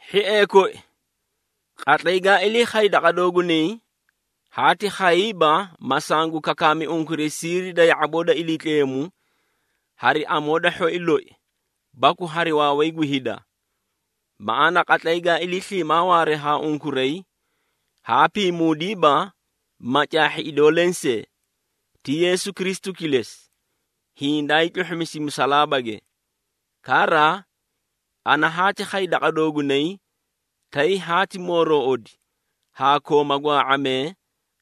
Hhiee koi, qatlay gaa ilii khay daqa doogunay, haati khayiiba, ma sangu kakaami unkuray siiri da ya⁄aboo da Iliitleemu hari amoo da hhoi loi, baku hari waaway gu hida. Maꞌaana qatlay gaa ilii sliimaa waaree haa unkuray, haa piimuudiiba, ma caahhi idoo lensee, ti Yeesu Kristu kilesi, hiĩ daa hiitluhhusi musalaabage. Kara, ana haati khay daqa doogunay, tay haati mooroꞌodi haa kooma gwaa⁄amee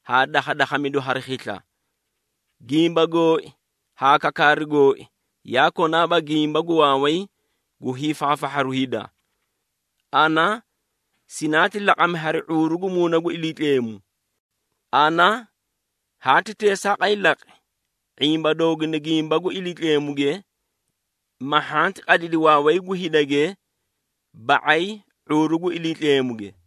haa dakhadakhamidu hari khisla. Gimba gooi haa kakaaru gooi yaa konaaba gimba gu waaway gu hiifaafahharu hida. Ana sinaati laqami hari ⁄uuru gu Muuna gu Iliitleemu. Ana haati teesaaqay laqi, ⁄imba dooguna gimba gu Iliitleemuge, ma hhanti qadidi waaway gu hidage ba⁄ay ⁄uuru gu Iliitleemuge.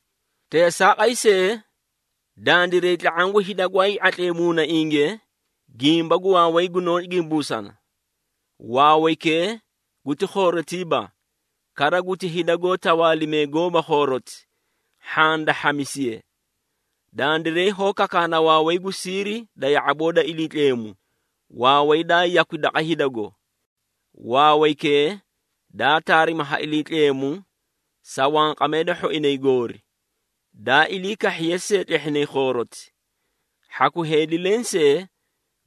Teesaaqay see, dandiray tla⁄aã gu hida gwaay ⁄atlee muunainge, gimba gu waaway gunoó gimbuusana. Waawaykee guti khoorotiiba, kara guti hida goó tawaalimee goóba gu khooroti, hhaã da hhamisiye. Dandiray hoó kakaana waaway gu siiri da ya⁄aboo da Iliitleemu, waaway daa yakwi daqa hidago. Waawaykee daa taarimi ha Iliitleemu sa wanqamee da hhoinay goori, daa ilii kahhiye see tlehhinay khooroti. Hhaku heedi lensee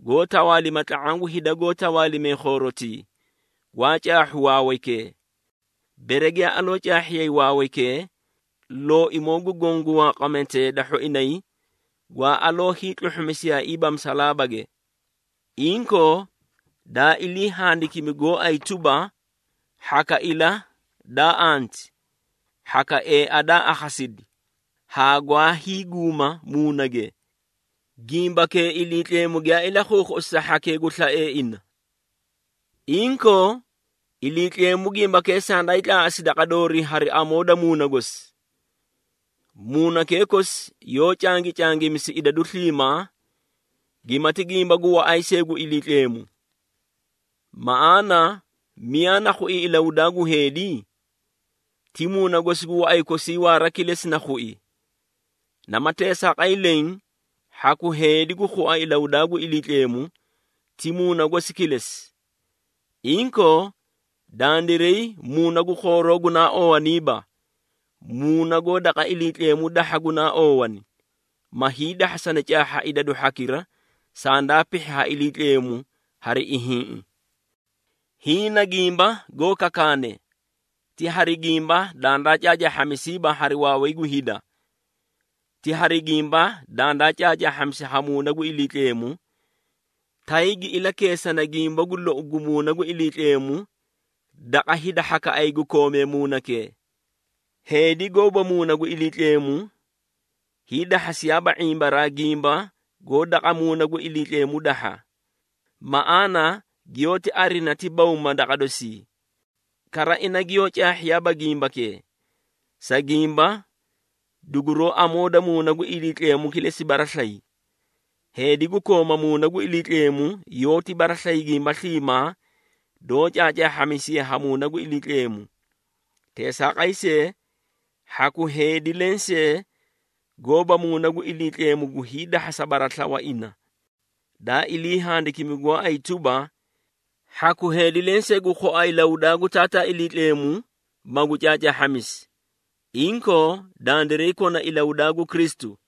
goó tawaalima tla⁄aã gu hida goó tawaalimee khoorotii, gwaa caahhu waawaykee. Bere giyaa aloo caahhiyay waawaykee, Looimoo gu Goõ gu wanqamee da hhoinay, gwaa aloo hiitluhhusiyaaiiba musalaabage. Inkoo, daa ilii handikimi gooay tuba, “Hhaka ila daa anti, hhaka eea daa akhasidi, haa gwaa hiiguuma muunage, gimbakee Iliitleemu giyaa ilakhuukhuꞌusi sa hhakee gu slaee ina.” Inkoo, Iliitleemu gimbakee sandaay tlaaꞌasi daqa doorii hari amoo da Muuna gosi. Muunakee kosi yoó cangicangimisi idadu sliimaa, gimati gimba gu waꞌay see gu Iliitleemu. Maꞌaana miyaa na khui ilahudaa gu heedi? Ti muuna gosi gu waꞌay kosii waara kilesi na khui. Nama teesaaqay lenge, hhaku heedi gu khua ilahudaa gu Iliitleemu, ti Muuna gosi kilesi. Inkoo, dandiray muuna gu khooroo gunaa oowaniiba, Muuna goó daqa Iliitleemu dahha gunaa oowani, ma hiidahhasani caahha idadu hhakira, sandaa pihhi ha Iliitleemu hari ihiĩꞌi. Hiĩ na gimba goó kakaane, ti hari gimba dandaa caacaahhamisiiba hari waaway gu hida. Ti hari gimba dandaa caacaahhamisi ha Muuna gu Iliitleemu, tay gi ilakeesana gimba gu lou gu Muuna gu Iliitleemu daqa hida hhakaꞌay gu koomee Muunakee. Heedi goóba Muuna gu Iliitleemu, hiidahhasiyaaba ⁄imbaraa gimba goó daqa Muuna gu Iliitleemu dahha. Maꞌaana giyoóti arina ti bawma daqa dosii. Kara ina giyoó caahhiyaaba gimbakee, sa gimba duguroó amoo da Muuna gu Iliitleemu kilesi baraslayi. Heedi gu kooma Muuna gu Iliitleemu yoóti baraslayi gimba sliimaa doó caacaahhamisiye ha Muuna gu Iliitleemu. Teesaaqay see, hhaku heedi lensee gooba Muuna gu Iliitleemu gu hiidahhasa baraslawa ina. Daa ilii handikimi gooay tuba, “Hhaku heedi lensee gu khua ilahudaa gu Taataa Iliitleemu, magu caacaahhamisi.” Inkoo, dandiray kona ilahudaa gu Kristu.